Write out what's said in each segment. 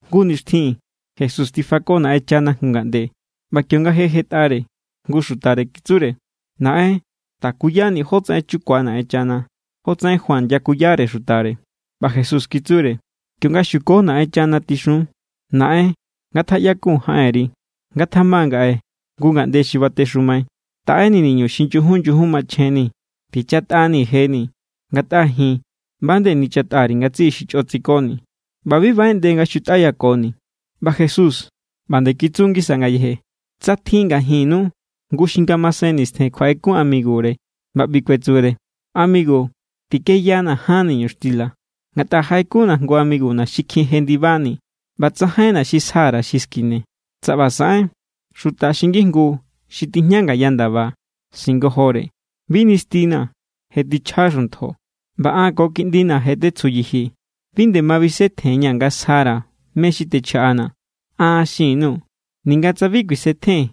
Jngu nixtjin Jesús tifako Naꞌenchana jngu ngaꞌnde; ꞌba kionga je jetꞌare, jngu xutare kitsure: —Naꞌen, takuyanii̱ jotsaꞌen chukua Naꞌenchana, jotsaꞌen Juan yakuyare xutare. ꞌBa Jesús kitsure: —Kionga xuko Naꞌenchana, tixun: Naꞌen, ngatjaꞌyakun jaꞌenri. Ngatjama ngaꞌe jngu ngaꞌnde xi batexumai. Taꞌenii̱ niñu xi nyujun nyujun machjenni̱. Tichatꞌanii̱ jeni̱, ngatꞌa ji̱n ꞌba nde nichatꞌa_ri̱ ngatsiꞌi xi chꞌo tsikoni̱. ꞌBa bi baꞌeꞌnde nga xutꞌáyakoni̱. ꞌBa Jesús ꞌba nde kitsu ngisa ngayeje: —Tsa tjin ngajinnu jngu xi ngamasen nistjen kjuaꞌekun amigure ꞌba ꞌbi kuetsure: “Amigu, tikeyana ján niñuxtila, ngatꞌa jaꞌekunna̱ jngu amiguna̱ xi kjin jendibani ꞌba tsajainna̱ xi sja_ra̱ xi skine.” Tsa ꞌba saꞌen, xuta xi ngijngu xi tijña ngaya ndaba singojore: “Bi nistinaa̱. Je tichja xuntjo, ꞌba an ko kiꞌndina̱ je tetsju yijii̱. Bi nde ma bisetjenña̱ nga sjara̱ mé= xi techjaꞌanaa̱.” An xin_nuu̱, ninga tsa bi kuisetjen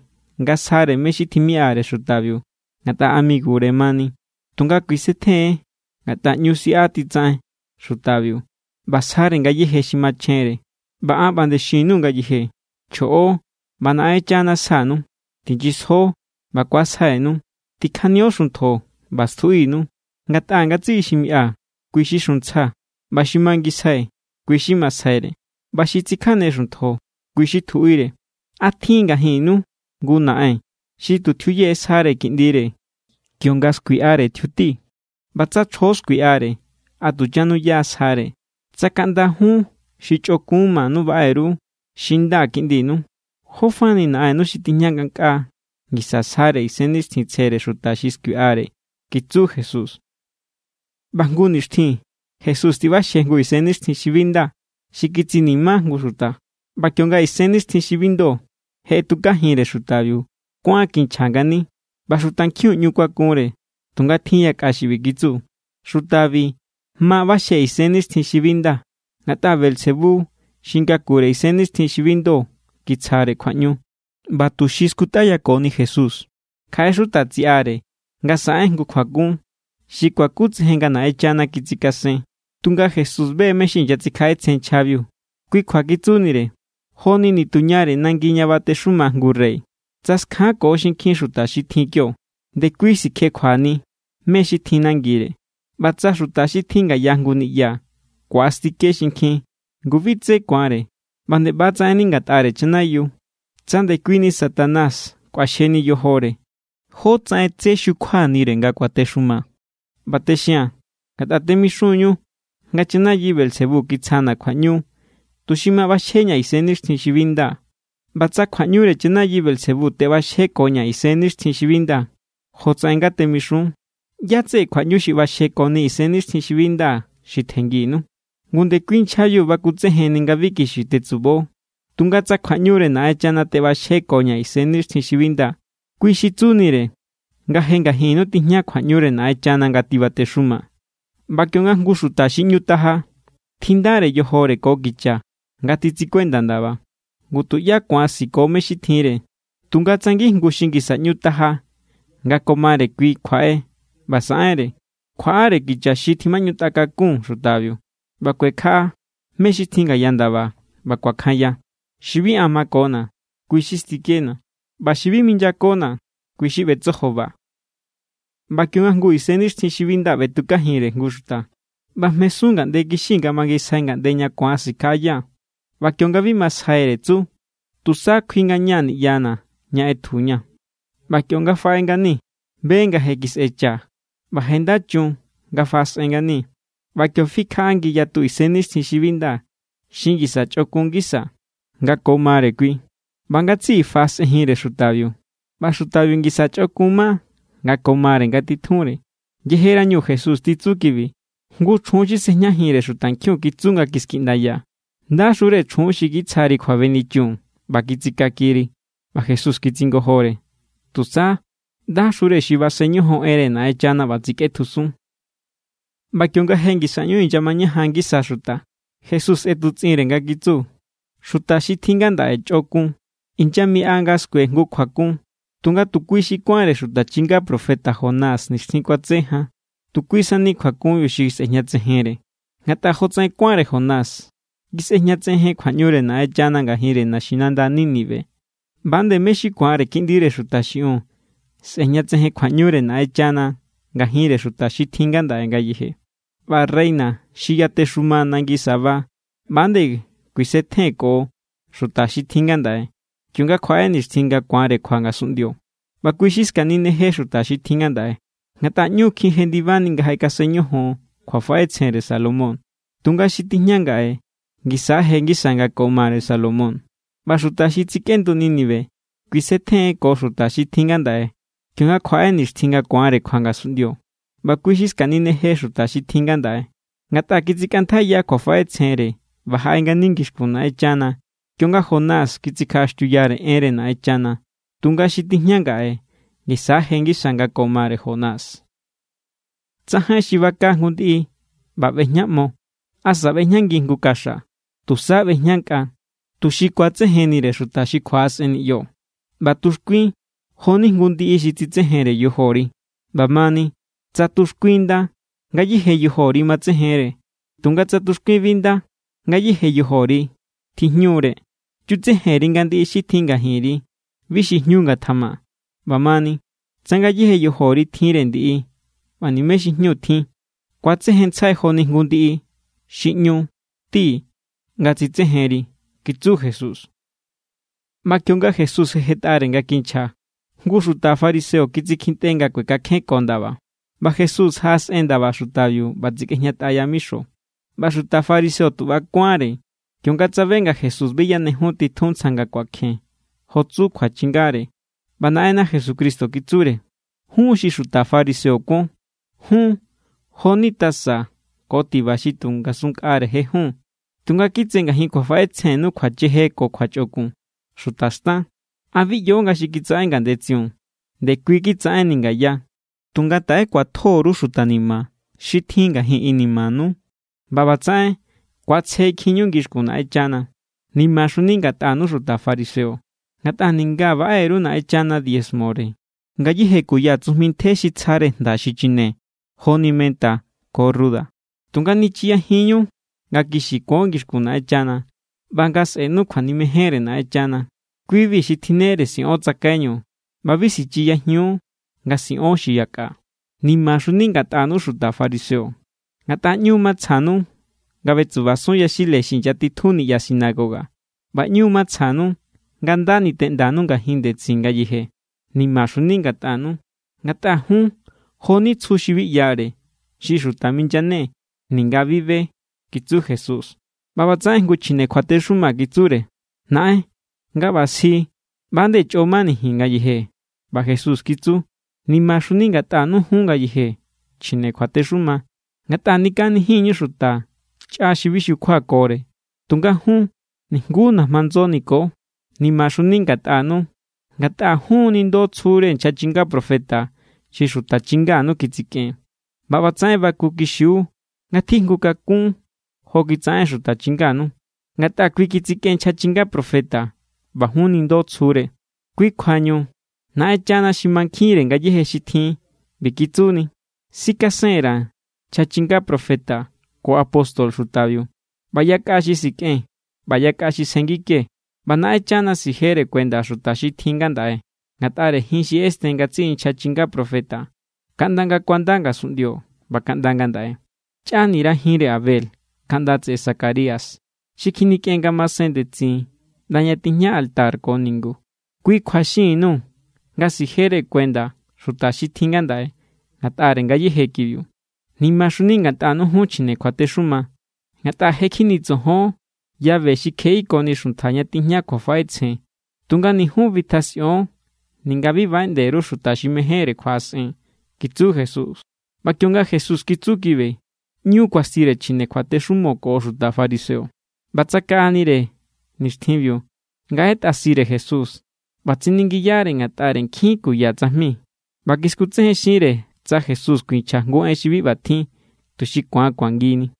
nga sjare mé= xi timiꞌare xutabiu ngatꞌa amigure mani, tunga kuisetjen= ngatꞌa ꞌñu siꞌa titsaꞌen xutabiu, ꞌba sjare ngayéje xi machjenre. ꞌBa an ꞌba nde xin_nuu̱ ngayeje: Chjoꞌo, ꞌba Naꞌenchana sjanu. Tinyisjo, ꞌba ku̱asjainu. Tikjanio xuntjo ꞌba stjuꞌinu. Ngatꞌa ngatsiꞌi xi miꞌa, kui= xi xuntsja. ꞌBa xi mangisjai, kui= xi masjaire. ꞌBa xi tsikjane xuntjo, kui= xi tjuꞌire. ’¿A tjin ngajinnu jngu naꞌen xi tu tjiuye sjare kiꞌndire, kionga skuiꞌare tjiuti? ꞌBa tsa chjo skuiꞌare, ¿a tu chanuya sjare? Tsa kaꞌnda jun xi chꞌokun manu baꞌe_ru xi nda kiꞌndinu, jófa ni Naꞌennu xi tijña ngankꞌaa ngisa sjare Isennixtjintsjere xuta xi skuiꞌare —kitsu Jesús. ꞌBa jngu nixtjin Jesús tiꞌbaxje jngu isennixtjin xi bi nda xi kitsini̱má jngu xuta, ꞌba kionga isennixtjin xi bi ndo je ꞌetjukajinre xutabiu, kuán kinchja ngani. ꞌBa xutankjiun ꞌñu kuakunre. Tunga tjin yakꞌa xi ꞌbi kitsu: —Xutabi ma ꞌbaxje isennixtjin xi bi nda ngatꞌa Beelzebú xi ngakure isennixtjin xi bi ndo kitsjare kjuaꞌñu. ꞌBa tuxi skutꞌayakoni Jesús, kjaꞌe xuta tsiꞌare nga saꞌen jngu kjuakun xi kuakutsejen nga Naꞌenchana kitsikasen. Tunga Jesús be= mé= xi inyatsikjaꞌetsjen nchjabiu, kui kjua kitsunire: —Joni nituñare nangi ña batexuma jngu rey. Tsa skjanko xinkjin xuta xi tjin kio, ndekui sikjekjuani mé= xi tjin nangire. ꞌBa tsa xuta xi tjin ngaya jngu niꞌya ku̱astike xinkjin, ngu bi tsé ku̱anre. ꞌBa nde ꞌba= tsaꞌenni ngatꞌare chanayiu. Tsa ndekuini Satanás kꞌuaxjeni yojore, ¿jótsaꞌen tsé xukjuanire nga kuatexuma? ꞌBa texia̱n, ngatꞌa temixun=ñu nga chanayi Beelzebú kitsjana̱ kjuaꞌñu tuxi ma ꞌbaxjeñaa̱ isennixtjin xi bi nda. ꞌBa tsa kjuaꞌñure chanayi Beelzebú teꞌbaxjekoña̱ isennixtjin xi bi nda, jotsaꞌen nga temixun, ¿ꞌyá= tseꞌe kjuaꞌñu xi ꞌbaxjekoni isennixtjin xi bi nda xi tjennginu? Ngu ndekui nchjabiu bakutsejenni nga bi kixi tetsubo. Tunga tsa kjuaꞌñure Naꞌenchana teꞌbaxjekoña̱ isennixtjin xi bi nda, kui xi tsunire nga je ngajinnu tijña kjuaꞌñure Naꞌenchana nga tibatexuma. ’ꞌBa kionga jngu xuta xi ꞌñu taja tjindare yojore ko kicha nga titsikuenda ndaba, ngu, tuꞌyá ku̱an siko mé= xi tjinre. Tunga tsa ngijngu xi ngisa ꞌñu taja nga ko mare kui kjuaꞌe ꞌba saꞌenre, kjuaꞌare kicha xi tjimaꞌñutꞌa kakun xutabiu, ꞌba kuekjaꞌa mé= xi tjin ngaya ndaba, ꞌba kuakjanya. ’Xi bi an makona̱, kui= xi stikena̱. ꞌBa xi bi minyakona̱, kui= xi ꞌbetsojoba. ’ꞌBa kionga jngu isennixtjin xi bi nda ꞌbetukajinre jngu xuta, ꞌbajmesun ngaꞌnde kixi nga mangisjai ngaꞌnde ña ku̱an sikjaꞌaya. ꞌBa kionga bi masjaire, tsu: “Tusa kjui ngaña̱ niꞌyana̱ ña ꞌetjuña̱.” ꞌBa kionga faꞌe ngani, be nga je kisꞌecha ꞌba je nda chun nga faꞌasꞌen ngani. ꞌBa kio fikjaꞌa ngiyatu isennixtjin xi bi nda xi ngisa chꞌokun ngisa nga ko mare kui, ꞌba ngatsiꞌi faꞌasꞌenjinre xutabiu. ꞌBa xutabiu ngisa chꞌokun ma nga ko mare ngatitjunre. Yejerañu Jesús titsu kibi, jngu chjun xi sꞌejñajinre xutankjiun kitsu nga kiskiꞌndaya: —¡Ndaxure chjun xi kitsjari kjuabenichun ꞌba kitsikakiri! ꞌBa Jesús kitsingojore: —Tusa, ¡ndaxure xi basen ñojon enre Naꞌenchana ꞌba tsikꞌetjusun! ꞌBa kionga je ngisa ꞌñu inyamañajan ngisa xuta, Jesús ꞌetutsꞌinre nga kitsu: —Xuta xi tjin ngandaꞌe chꞌokun. Inyamiꞌa nga skue jngu kjuakun, tunga tu kui= xi kuánre xuta chinga profeta Jonás nixtjin kuatse jan, tu kui sani kjuakunbiu xi sꞌejñatsejenre. Ngatꞌa jotsaꞌen kuánre Jonás kisꞌejñatsejen kjuaꞌñure Naꞌenchana ngajinre naxinanda Nínive, ꞌba=nde mé= xi ku̱anre Kiꞌndire Xuta xiꞌiun sꞌe̱jñatsejen kjuaꞌñure Naꞌenchana ngajinre xuta xi tjin ngandaꞌe ngayeje. ꞌBa reina xi yatexuma nangi Sabá ꞌba=nde kuisetjen ko xuta xi tjin ngandaꞌe, kionga kjuaꞌe nixtjin nga ku̱anre kjua ngasunꞌndio. ꞌBa kui= xi skanineje xuta xi tjin ngandaꞌe, ngatꞌa ꞌñu= kjin jendibani nga jaꞌekasen ñojon kjuafaꞌetsjenre Salomón. Tunga xi tijña ngaꞌe ngisa= je ngisa nga ko mare Salomón. ꞌBa xuta xi tsikꞌendu Nínive kuisetjen ko xuta xi tjin ngandaꞌe, kionga kjuaꞌe nixtjin nga ku̱anre kjua ngasunꞌndio. ꞌBa kui= xi skanineje xuta xi tjin ngandaꞌe, ngatꞌa kitsikꞌantjaiya kjuafaꞌetsjenre ꞌba jaꞌe ngani ngixkun Naꞌenchana kionga Jonás kitsikjaꞌaxtiuyare enre Naꞌenchana. Tunga xi tijña ngaꞌe ngisa= je ngisa nga ko mare Jonás. ’Tsajain xi baka jngu ndiꞌi ꞌba ꞌbejñaꞌmo asa ꞌbejñangi jngu kaxa. Tusa ꞌbejña nkꞌa, tuxi kuatsejennire xuta xi kjuaꞌasꞌen niꞌyo. ꞌBa tuxkuin jo=ni jngu ndiꞌi xi tsitsejenre yojori. ꞌBa mani, tsa tuxkuin nda, ngayéje yojori matsejenre. Tunga tsa tuxkuin bi nda, ngayéje yojori tjijñu=re. Chutsejen_ri nga ndiꞌi xi tjin ngajinri bi xi jñu ngatjama. ꞌBamani, tsa ngayéje yojori tjinre ndiꞌi ꞌba nimé xi jñu tjin, ku̱atsejenntsjai joni jngu ndiꞌi xi ꞌñu ti nga tsitsejenri —kitsu Jesús. ꞌBa kionga Jesús je jetꞌare nga kinchja, jngu xuta fariseo kitsikjintꞌe nga kuekakjenko ndaba. ꞌBa Jesús jaꞌasꞌen ndaba xutabiu ꞌba tsikꞌejñatꞌa yamixo. ꞌBa xuta fariseo tu ꞌba= kuánre, kionga tsabe nga Jesús bi yanejun titjun ntsja nga kuakjen jo tsu kjuachingare. ꞌBa Naꞌenna Jesucristo kitsure: —Jun xi xuta fariseo kuon, jun jo=ni tasa ko tiba xi tu ngasun nkꞌare jejun, tunga kitse ngajin kjuafaꞌetsjennu kjuacheje ko kjuachꞌokun. ¡Xuta xtan! ¿A bi ꞌyo nga xi kitsaꞌen ngandetsiun, ndekui kitsaꞌenni ngaya? Tunga taꞌe kjuatjo_ru xuta ni̱ma̱ xi tjin ngajin inimanu, ꞌba ꞌbatsaꞌen ku̱atsjekjinñu ngixkun Naꞌenchana. ’¡Nimaxuni ngatꞌanu xuta fariseo! Ngatꞌa ninga baꞌe_ru Naꞌenchana diezmore ngayéje kuya tsujmi ntje xi tsjare jnda xi chine joni menta ko ruda, tunga nichiyajinñu nga kixi kuon ngixkun Naꞌenchana ꞌba nga sꞌe̱nu kjuanimejenre Naꞌenchana. Ki=bi xi tjinnere siꞌon tsakaiñu, ꞌba bi sichiyajiun nga siꞌon xi yakꞌa. ’¡Nimaxuni ngatꞌanu xuta fariseo! Ngatꞌa ꞌñu matsjanu nga ꞌbetsubasun yaxile xi inyatitjun niꞌya sinagoga, ꞌba ꞌñu matsjanu nga nda niteꞌndanu ngajin ndetsin ngayeje. ’¡Nimaxuni ngatꞌanu! Ngatꞌa jun jo=ni tsju xi bi ꞌyare, xi xuta minyane ninga bi be —kitsu Jesús. ꞌBa ꞌbatsaꞌen jngu chjine kjuatexuma kitsure: —Naꞌen, nga ꞌba sji, ꞌba=nde chꞌo mani ji̱n ngayeje. ꞌBa Jesús kitsu: —¡Nimaxuni ngatꞌanu jun ngayeje chjine kjuatexuma! Ngatꞌa nikaꞌanijinñu xuta chꞌa xi bi xukjuakore. Tunga jun, nijnguú najma ndso niko. ’¡Nimaxuni ngatꞌanu! Ngatꞌa jun nindo tsjure nchja chinga profeta xi xuta chinganu kitsikꞌen. ꞌBa ꞌbatsaꞌen bakukixiu nga tjijngu kakún jo kitsaꞌen xuta chinganu. Ngatꞌa kui kitsikꞌen nchja chinga profeta ꞌba jun nindo tsjure. ’Kui kjuañu Naꞌenchana xi mankjinre ngayéje xi tjin ꞌbi kitsuni: “Sikasen_ra̱ nchja chinga profeta ko apóstol xutabiu, ꞌba yakꞌa xi sikꞌen ꞌba yakꞌa xi sjenngike.” ꞌBa Naꞌenchana sijere kuenda xuta xi tjin ngandaꞌe ngatꞌare jin xi ꞌesten ngatsiꞌi nchja chinga profeta kaꞌnda nga kuanda ngasunꞌndio ꞌba kaꞌnda ngandaꞌe. Chꞌanira jinre Abel, kaꞌnda tseꞌe Zacarías xi kjinikꞌen ngamasen ndetsin ꞌnda ña tijña altar ko ningu. Kui kjua xinni_nuu̱ nga sijere kuenda xuta xi tjin ngandaꞌe ngatꞌare ngayéje kibiu. ’¡Nimaxuni ngatꞌanu jun chjine kjuatexuma! Ngatꞌa je kjinitsojon llave xi kjeꞌikoni xuntja ña tijña kjuafaꞌetsjen. Tunga ni jun bitjasꞌion ninga bi baꞌeꞌnde_ru xuta xi mejénre kjuaꞌasꞌen —kitsu Jesús. ꞌBa kionga Jesús kitsu kibi, ꞌñu kuastire chjine kjuatexumo ko xuta fariseo. ꞌBa tsakaꞌanire nixtjinbiu nga ꞌetꞌasire Jesús ꞌba tsiningiyare ngatꞌare nkjin kuya tsajmi. ꞌBa kiskutsejenxinre tsa Jesús kuinchja jngu en xi bi ꞌbatjin, tuxi ku̱an kuangini.